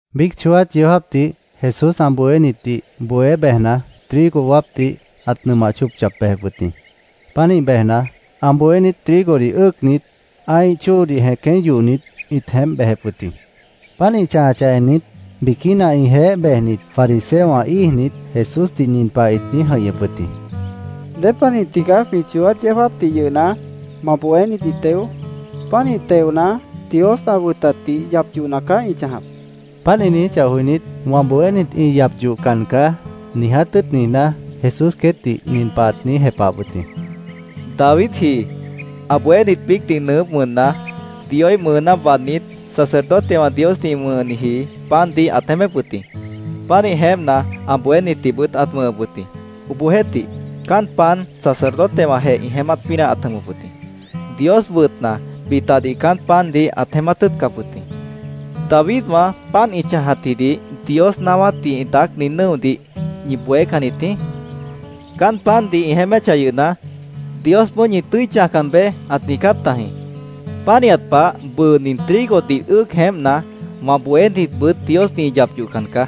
Biíc chooát yeó jáapdih Jesús ã bohénitdih bohé bejna, trigo wáapdih ãt nʉmah chóop yap bejep wʉt jĩ. Pánih bejna, ã bohénit trigodih ʉ́ʉcnit, ã́ih chóodih jẽqué yohnit, ĩt jeémp bejep wʉt jĩ. Páant ĩ chãjachah ennit, biquína ĩjeéh bejnit fariseowã íijnit, Jesúsdih nin pah ĩt niíj jʉ̃ihñʉp wʉt jĩ: —¿Dépanih tigaá jwĩ chooát yeó jáapdih yʉhna, ma bohénit ĩ teo? Pánih teona, Dios ã wʉtatdih yap yohna caá ĩ chãjap, ĩt niijíp wʉt jĩ. Páant ĩ niijíchah joinít, “Wã bohénit ĩ yap yohcan caá”, niiját tʉ́ʉt niijná, Jesús queétdih nin pah ãt niíj jepahap wʉt jĩ: —Davidji ã bohénit biícdih nʉʉgʉ́p wʉnna, Dioíh mʉʉná waadnít, sacerdotewã Diosdih ĩ wʉ̃hniji pandih ãt jeémép wʉt jĩ. Pánih jeémpna, ã bohénitdihbʉt ãt wʉ̃hʉp wʉt jĩ. Obohjeéhtih, caán pan sacerdotewãjeh ĩ jeémát pínah ãt jʉmʉp wʉt jĩ. Dios wʉtna, bitadih caán pandih ãt jeémát tʉ́ʉtcap wʉt jĩ. ¿Davidwã páant ĩ chãjatjidih Dios naáwátdih ĩ daácni nʉ́odih ñi bohécannit jĩí? Caán pandih ĩ jeéméchah yʉhna, Diosboó ‘Ñi tʉ́i chãjcan beé’, ãt niijcáp tajĩ.Pánihat pah, bʉʉ nin trigodih ʉ́ʉc jeémpna, wã bohénitbʉt Diosdih ĩ yap yohcan caá.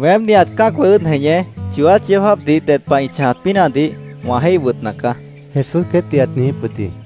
Weém, nihat cã́acwã ʉ́ʉd jeñé, chooát yeó jáapdih ded pah ĩ chãjat pínahdih wã jéih wʉtna caá, Jesús queétdih ãt niijíp wʉt jĩ.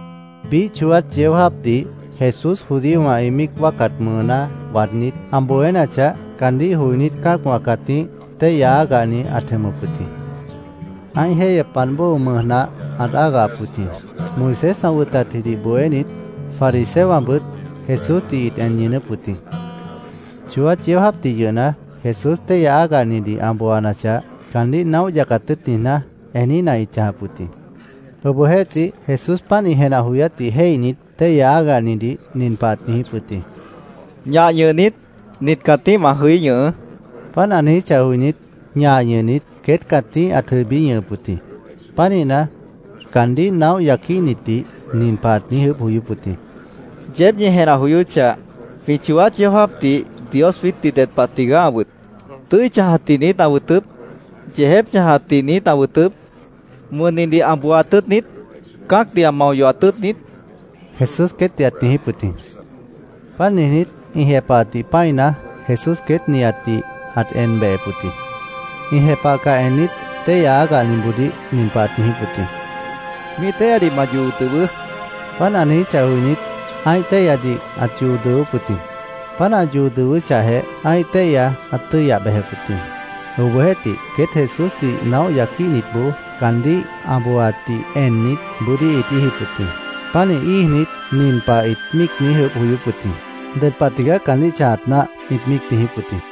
Biíh chooát yeó jáapdih Jesús judíowã ĩ míic wáacat mʉʉná waadnít, ã bohénachah, caandíh joinít cã́acwã cãtíh téihya ágahni ãt jʉmʉp wʉt jĩ. Ã́ih jéihyepmant bóo mʉj nah ãt ágahap wʉt jĩ. Moisés ã wʉtatjidih bohénit, fariseowãbʉt Jesúsdih ĩt en ñʉʉnʉ́p wʉt jĩ. Chooát yeó jáapdih yʉhna, Jesús téihya ágahnidih ã booanachah, caandíh naóh yacat tʉ́ʉt niijná, eníhna ĩt chãjap wʉt jĩ. Obohjeéhtih, Jesús páant ĩ jenah joyátdih jéihnit, téihya ágahnidih nin pah ãt niijíp wʉt jĩ: —Ñah ñʉhnit, nit cãtíh ma jʉí ñʉhʉʉ́, ãt niijíp wʉt jĩ. Páant ã niijíchah joinít, ñah ñʉhnit, queét cãtíh ãt jʉibí ñʉhʉp wʉt jĩ. Pánihna, caandíh naóh yaquíhnitdih nin pah ãt niíj ʉʉ́bh joyóp wʉt jĩ: —Yeéb ñi jenah joyóchah, ¿jwĩ chooát yeó jáapdih Dios jwiítdih ded pah tigaá ã wʉt? ¿Tʉ́i chãjatdih niít ã wʉtʉp? ¿Yeejép chãjatdih niít ã wʉtʉp? ¿Wʉnnidih ã booat tʉ́ʉt niít? ¿Cã́acdih ã mao yohat tʉ́ʉt niít? Jesús queétdih ãt niijíp wʉt jĩ. Páant niijnít, ĩ jepahatdih pã́ina, Jesús queét nihatdih ãt en behep wʉt jĩ. Ĩ jepahcah ennit, téihya ágahniboodíh nin pah ãt niijíp wʉt jĩ: —Míih téihyadih ma yoo dʉwʉʉ́, ãt niijíp wʉt jĩ. Páant ã niijíchah joinít, ã́ih téihyadih ãt yoo dʉwʉ́p wʉt jĩ. Páant ã yoo dʉwʉ́chahjeh, ã́ih téihya ãt tʉ́yah bejep wʉt jĩ. Obohjeéhtih, queét Jesúsdih naóh yaquíhnitboó caandíh ã booaatdih ennit, bʉ́dí ĩt íijip wʉt jĩ. Pánih íijnit, nin pah ĩt míic niíj ʉʉ́bh joyóp wʉt jĩ: “¿Ded pah tigaá caandíh chãjat náah?” ĩt míic niijíp wʉt jĩ.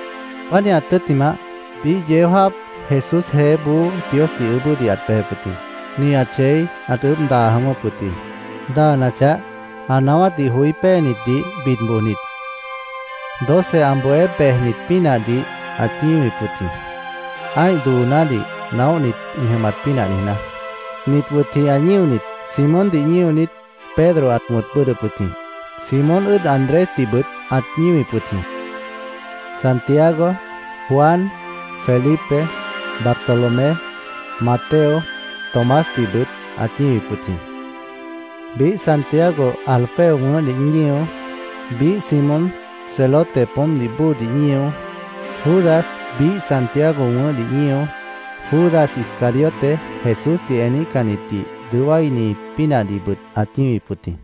Pánihat tʉ́ttimah, biíh yeó jáap Jesús jeéboó Diosdih ʉʉ́bʉ́dih ãt bejep wʉt jĩ. Nihat chei ãt ʉʉ́bh daa jʉ̃ʉ́wʉ́p wʉt jĩ. Daanachah, ã naáwátdih joí péenitdih bid bojnit, doce ã bohé bejnit pínahdih ãt ñíwip wʉt jĩ, ã́ih doonádih naóhnit ĩ jʉmat pínah niijná. Nit wʉt jĩ ã ñíonit: Simóndih ñíonit, Pedro ã wʉ̃t ãt bʉ́ʉdhdʉp wʉt jĩ. Simón ʉ́ʉd Andrésdihbʉt ãt ñíwip wʉt jĩ. Santiago, Juan, Felipe, Bartolomé, Mateo, Tomásdihbʉt ãt ñíwip wʉt jĩ. Biíh Santiago Alfeo wʉ̃ʉ́hdih ñío, biíh Simón Celote poómpdih bóodih ñío, Judas biíh Santiago wʉ̃ʉ́hdih ñío, Judas Iscariote Jesúsdih eníhcannitdih dʉó wáini pínahdihbʉt ãt ñíwip wʉt jĩ.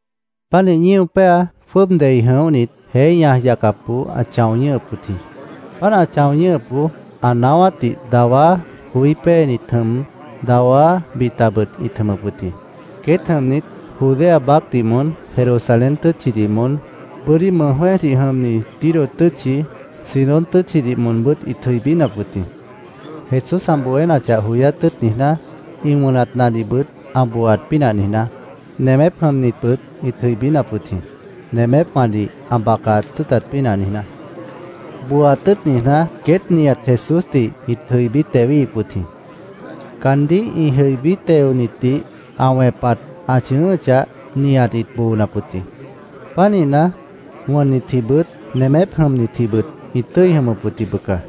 Pánih ñío péa jwʉ́ʉb dei jʉ̃óhnit, jeé ñaj yacapboó ãt chão ñʉ́hʉp wʉt jĩ. Páant ã chão ñʉ́hʉpboó ã naáwátdih dawá joí péenit jʉm, dawá bitabʉt ĩt jʉmʉp wʉt jĩ. Queét jʉmnit Judea baácdih moón, Jerusalén tʉ́tchidih moón, bʉ́dí mʉj jwẽ́ejdih jʉmni Tiro tʉ́tchi, Sidón tʉ́tchidih moonbʉ́t ĩt jʉibínap wʉt jĩ, Jesús ã bohénachah joyát tʉ́ʉt niijná, ĩ wʉnatnadihbʉt ã booaat pínah niijná. Nemép jʉmnitbʉt ĩt jʉibínap wʉt jĩ, nemépwãdih ã bacat tʉ́ʉtat pínah niijná. Booat tʉ́ʉt niijná, queét nihat Jesúsdih ĩt jʉibí tewíhip wʉt jĩ. Caandíh ĩ jʉibí teonitdih ã wẽpat ã chʉ̃ʉ́ʉ́chah, nihat ĩt boonap wʉt jĩ. Pánihna, wʉnnitjibʉt, nemép jʉmnitjibʉt ĩt tʉ́i jʉmʉp wʉt jĩ, bʉca.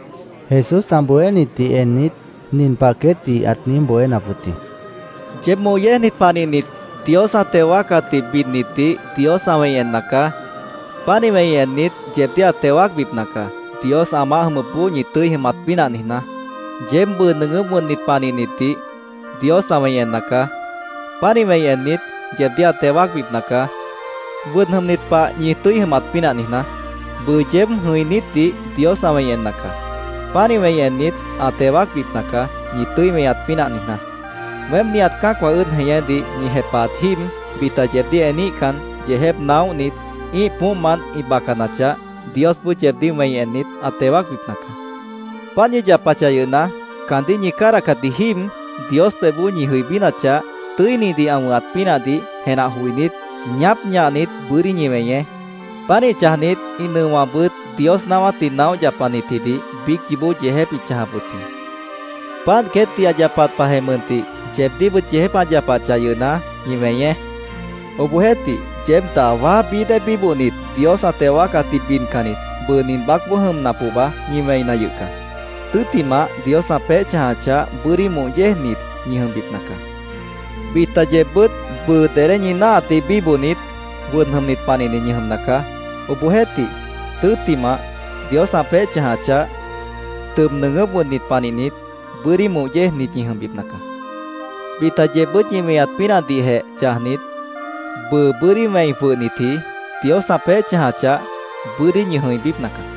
Jesús ã bohénitdih ennit, nin pah queétdih ãt niíj bohénap wʉt jĩ: “Yeéb moh yéejnit panihnit Dios ã teo wáacatdih bidnitdih Dios ã wẽi enna caá. Pánih wẽi ennit, yeebdíh ã teo wáacbipna caá, Dios ã maáh jʉmʉpboó ñi tʉ́i jʉmat pínah niijná. “Yeéb bʉʉ nʉʉgʉ́p wʉnnit panihnitdih Dios ã wẽi enna caá. Pánih wẽi ennit, yeebdíh ã teo wáacbipna caá, wʉd jʉmnit pah ñi tʉ́i jʉmat pínah niijná. “Bʉʉ yeéb jʉ̃inítdih Dios ã wẽi enna caá. Pánih wẽi ennit, ã teo wáacbipna caá, ñi tʉ́i weñat pínah niijná. “Weém nihat cã́acwã ʉ́ʉd jeñédih ñi jepahat jíib bita yeebdíh eníhcan, yeejép naóhnit, ĩ́ih poómpmant ĩ bacanachah, Diosboó yeebdíh wẽi ennit, ã teo wáacbipna caá. Páant ñi yapachah yʉhna, caandíh ñi cádahcatji jíib Dios pebhboó ñi jʉibínachah, tʉ́inidih ã wʉ̃hat pínahdih jenah joinít, ñaáp ñahnit, bʉ́dí ñi weñeé. Pánih chãjnit ĩ nʉowãbʉt Dios naáwátdih naóh yapanitjidih biíc yoobó yeejép ĩt chãjap wʉt jĩ. Páant queétdih ã yapat pahjeh mʉntih yeebdíhbʉt yeejép ã yapachah yʉhna, ñi weñeé. “Obohjeéhtih, yeéb dawá bií dée bíbohnit, Dios ã teo wáacatdih bidcannit, bʉʉ nin baácboó jʉmna pohba ñi wẽina yʉh caá. Tʉ́ttimah, Dios ã peéh chãjachah, bʉ́dí moh yéejnit ñi jʉmbipna caá. “Bita yeebbʉ́t bʉʉ dedé ñi náahatdih bíbohnit, wʉd jʉmnit panihnit ñi jʉmna caá. Obohjeéhtih, tʉ́ttimah, Dios ã peéh chãjachah, tʉb nʉʉgʉ́p wʉnnit panihnit, bʉ́dí moh yéejnit ñi jʉmbipna caá. “Bita yeebbʉ́t ñi weñat pínahdihjeh chãjnit, bʉʉ bʉ́dí wẽi jwʉhnitji, Dios ã peéh chãjachah, bʉ́dí ñi jʉ̃ibípna caá.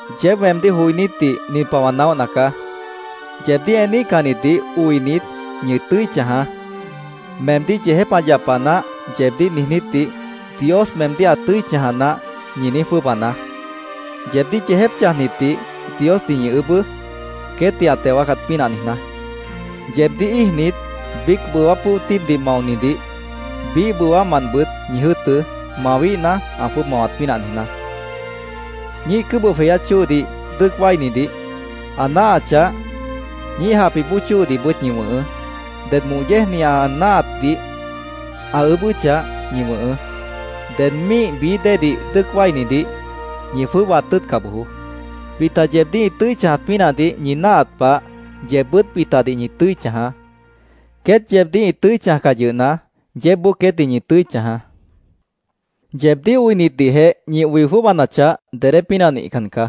“Obohjeéhtih, yeéb weemdíh joinítdih nin pah wã naóhna caá: Yeebdíh eníhcannitdih oinit, ñi tʉ́i chãjaá. ‘Meemdíh yeejép ã yapa naáh’, yeebdíh niijnítdih, ‘Dios meemdíh ã tʉ́i chãja naáh’, ñi niíj jwʉ́ʉbanaá. Yeebdíh yeejép chãjnitdih, Diosdih ñi ʉʉ́bʉ́, queétdih ã teo wáacat pínah niijná. Yeebdíh íijnit, biíc bʉwá pʉ́o tíibdih maonidih, biíh bʉwámantbʉt ñi jʉ́ʉtʉ́, mawíhna, ã jwʉ́ʉb mawat pínah niijná. Ñíih cʉ́bʉh jweyát chóodih dʉ́ʉc wáinidih, ã náahachah, ñíih japih bóo chóodihbʉt ñi wʉ̃hʉʉ́. Ded moh yéejni ã náahatdih ã ʉʉ́bʉ́chah, ñi wʉ̃hʉʉ́. Ded ñíih bií déedih dʉ́ʉc wáinidih, ñi jwʉ́ʉbaat tʉ́ʉtca bojoó. Bita yeebdíh ĩ tʉ́i chãjat pínahdih ñi náahat pah, yeebbʉ́t bitadih ñi tʉ́i chãjaá. Queét yeebdíh ĩ tʉ́i chãjcah yʉhna, yeébboó queétdih ñi tʉ́i chãjaá. “Yeebdíh oinitdihjeh ñi oi jwʉ́ʉbanachah, dedé pínah nihcan caá.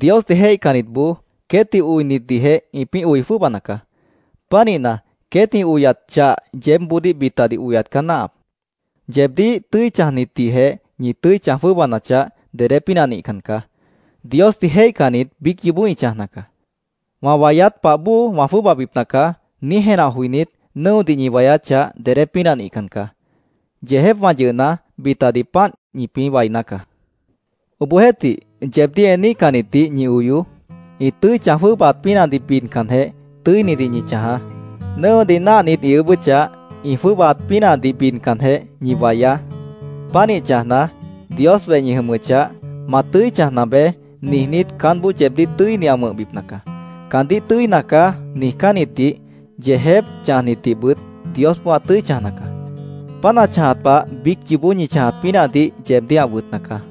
Diosdih jéihcannitboó queétdih oinitdihjeh ĩpĩ́ oi jwʉ́ʉbana caá. Pánihna, queét ĩ oyat chah yeébboodíh bitadih oyat caá náahap. Yeebdíh tʉ́i chãjnitdihjeh ñi tʉ́i chãj jwʉ́ʉbanachah, dedé pínah nihcan caá. Diosdih jéihcannit biíc yoobó ĩ chãjna caá. ‘Wã wayát pah bóo ã jwʉ́ʉbabipna caá’, niíj jenah joinít, nʉ́odih ñi wayáchah, dedé pínah nihcan caá. Yeejépwã yʉhna, bitadih páant ĩpĩ́ wainá caá. Obohjeéhtih, yeebdíh eníhcannitdih ñi oyoó. Ĩ tʉ́i chãj jwʉ́ʉbaat pínahdih bidcanjeh, tʉ́inidih ñi chãjaá. Nʉ́odih náahnit ĩ ʉʉ́bʉ́chah, ĩ jwʉ́ʉbaat pínahdih bidcanjeh, ñi wayaá. Pánih chãjna, Dios weh ñi jʉmʉchah, ‘Ma tʉ́i chãjna beé’, niijnít, caánboó yeebdíh tʉ́ini ã wʉ̃hbipna caá. Caandíh ‘Tʉ́ina caá’, niijcánnitdih, yeejép chãjnitdihbʉt Diosboó ã tʉ́i chãjna caá. Páant ã chãjat pah biíc yoobó ñi chãjat pínahdih yeebdíh ã wʉtna caá.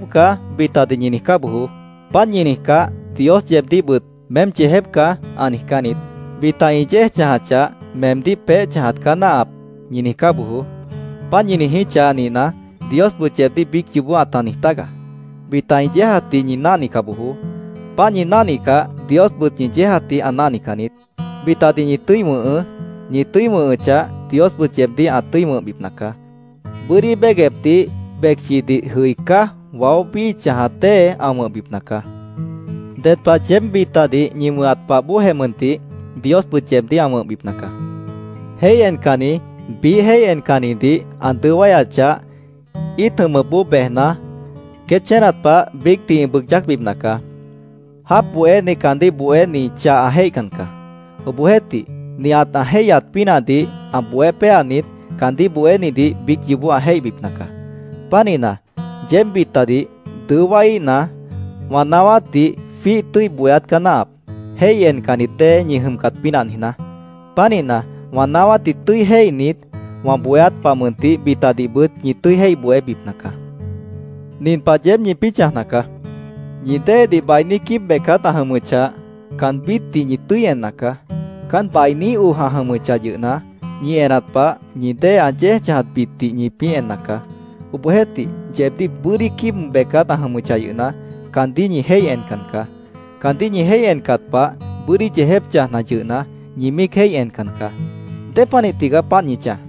“ ‘Meém yeejép caá’, bitadih ñi niijcá bojoó. Páant ñi niijcáh, Dios yeebdíhbʉt ‘Meém yeejép caá’, ã niijcán niít. Bita ĩ yéej chãjachah, ‘Meemdíh peéh chãjat caá náahap’, ñi niijcá bojoó. Páant ñi niijíchah nihna, Diosbʉt yeebdíh biíc yoobó ãta niij tágaá. Bita ĩ yéejatdih ñi náhnica bojoó. Páant ñi náhnicah, Diosbʉt ñi yéejatdih ã náhnican niít. Bitadih ñi tʉ́i wʉ̃hʉʉ́. Ñi tʉ́i wʉ̃hʉchah, Diosbʉt yeebdíh ã tʉ́i wʉ̃hbipna caá. Bʉ́dí béguepdih becchidih jʉi cáj waó bíi chãjat dée ã wʉ̃hbipna caá. Ded pah yeéb bitadih ñi wʉ̃hat pah bóojeh mʉntih, Diosbʉt yeebdíh ã wʉ̃hbipna caá. “Jéih encanni biíh jéih encannidih ã dʉó wáyachah, íit jʉmʉpboó bejna, queét chénat pah biícdih ĩ bʉʉg yácbipna caá Jáap bohéni caandíh bohéni chah ã jéihcan caá. Obohjeéhtih, nihat ã jéihyat pínahdih ã bohé péanit, caandíh bohénidih biíc yoobó ã jéihbipna caá. Pánihna, yeéb bitadih dʉó wáiíhna, wã naáwátdih jwíih tʉ́i bohéát caá náahap, jéih encannit dée ñi jʉmcat pínah niijná. Pánihna, wã naáwátdih tʉ́i jéihnit, wã bohéát pah mʉntih bitadihbʉt ñi tʉ́i jéih bohébipna caá. “Nin pah yeéb ñipĩ́ chãjna caá: Ñi déedih bainí quíib becát ã jʉmʉchah, caanbítdih ñi tʉ́i enna caá. Caán bainí oj ã jʉmʉchah yʉhna, ñi enat pah, ñi dée ã yéejatbitdih ñipĩ́ enna caá. Obohjeéhtih, yeebdíh bʉ́dí quíib becát ã jʉmʉchah yʉhna, caandíh ñi jéih encan caá. Caandíh ñi jéih encat pah, bʉ́dí yeejép chãjna yʉhna, ñi míic jéih encan caá. ¿Dépanih tigaá páant ñi chãj?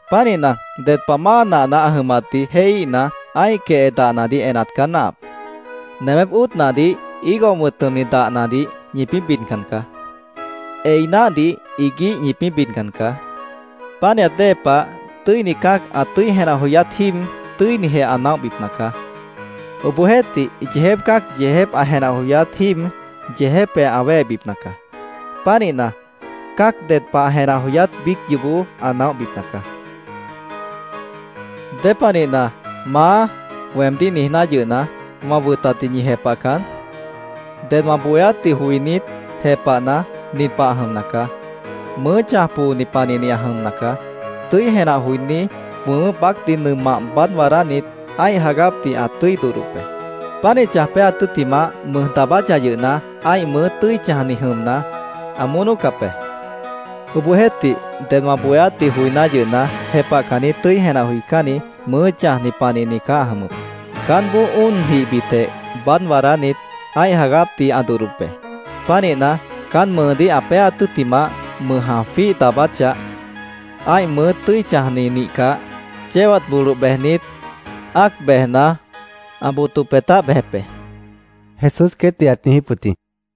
Pánihna, ded pah máa nahna ã jʉmatdih jéihíhna, ã́ih quehe dahnadih enat caá náahap. Nemép óot nahdih higo wʉ̃t jʉmni dahnadih ñipĩ́ bidcan caá. Ei náhdih iguíh ñipĩ́ bidcan caá. Pánihat dée pah tʉ́ini cã́ac ã tʉ́i jenah joyát jíib, tʉ́inijeh ã naóhbipna caá. Obohjeéhtih, yeejép cã́ac yeejép ã jenah joyát jíib, yeejépjeh ã wéhebipna caá. Pánihna, cã́ac ded pah ã jenah joyát biíc yoobó ã naóhbipna caá”, Jesús ãt niijíp wʉt jĩ. “¿Dépanihna, ‘Maá’, weemdíh niijná yʉhna, wã wʉtatdih ñi jepahcan? Ded wã bohéátdih joinít, jepahna, nin pah ã jʉmna caá: Mʉʉ́ chãj pooni panihni ã jʉmna caá. Tʉ́i jenah joiní jwʉmʉ́p baácdih nʉmah baád waadánit, ã́ih jagápdih ã tʉ́i dodhdop be. Pánih chãj péaat tʉ́ttimah, mʉj daabáchah yʉhna, ã́ih mʉʉ́ tʉ́i chãjni jʉmna, ã mónócap be. Obohjeéhtih, ded wã bohéátdih joiná yʉhna, jepahcanni tʉ́i jenah joicánni mʉʉ́ chãjni panihni caá ã jʉmʉp. Caánboó óon jihbitjeh baád waadánit, ã́ih jagápdih ã dodhdop be. Pánihna, caán mʉʉdíh ã péaat tʉ́ttimah, mʉj ã jwíih daabáchah, ã́ih mʉʉ́ tʉ́i chãjni nihcah, chéwat boloh bejnit, ã́ac bejna, ã boto peetáh bejep be”, Jesús queétdih ãt niijíp wʉt jĩ.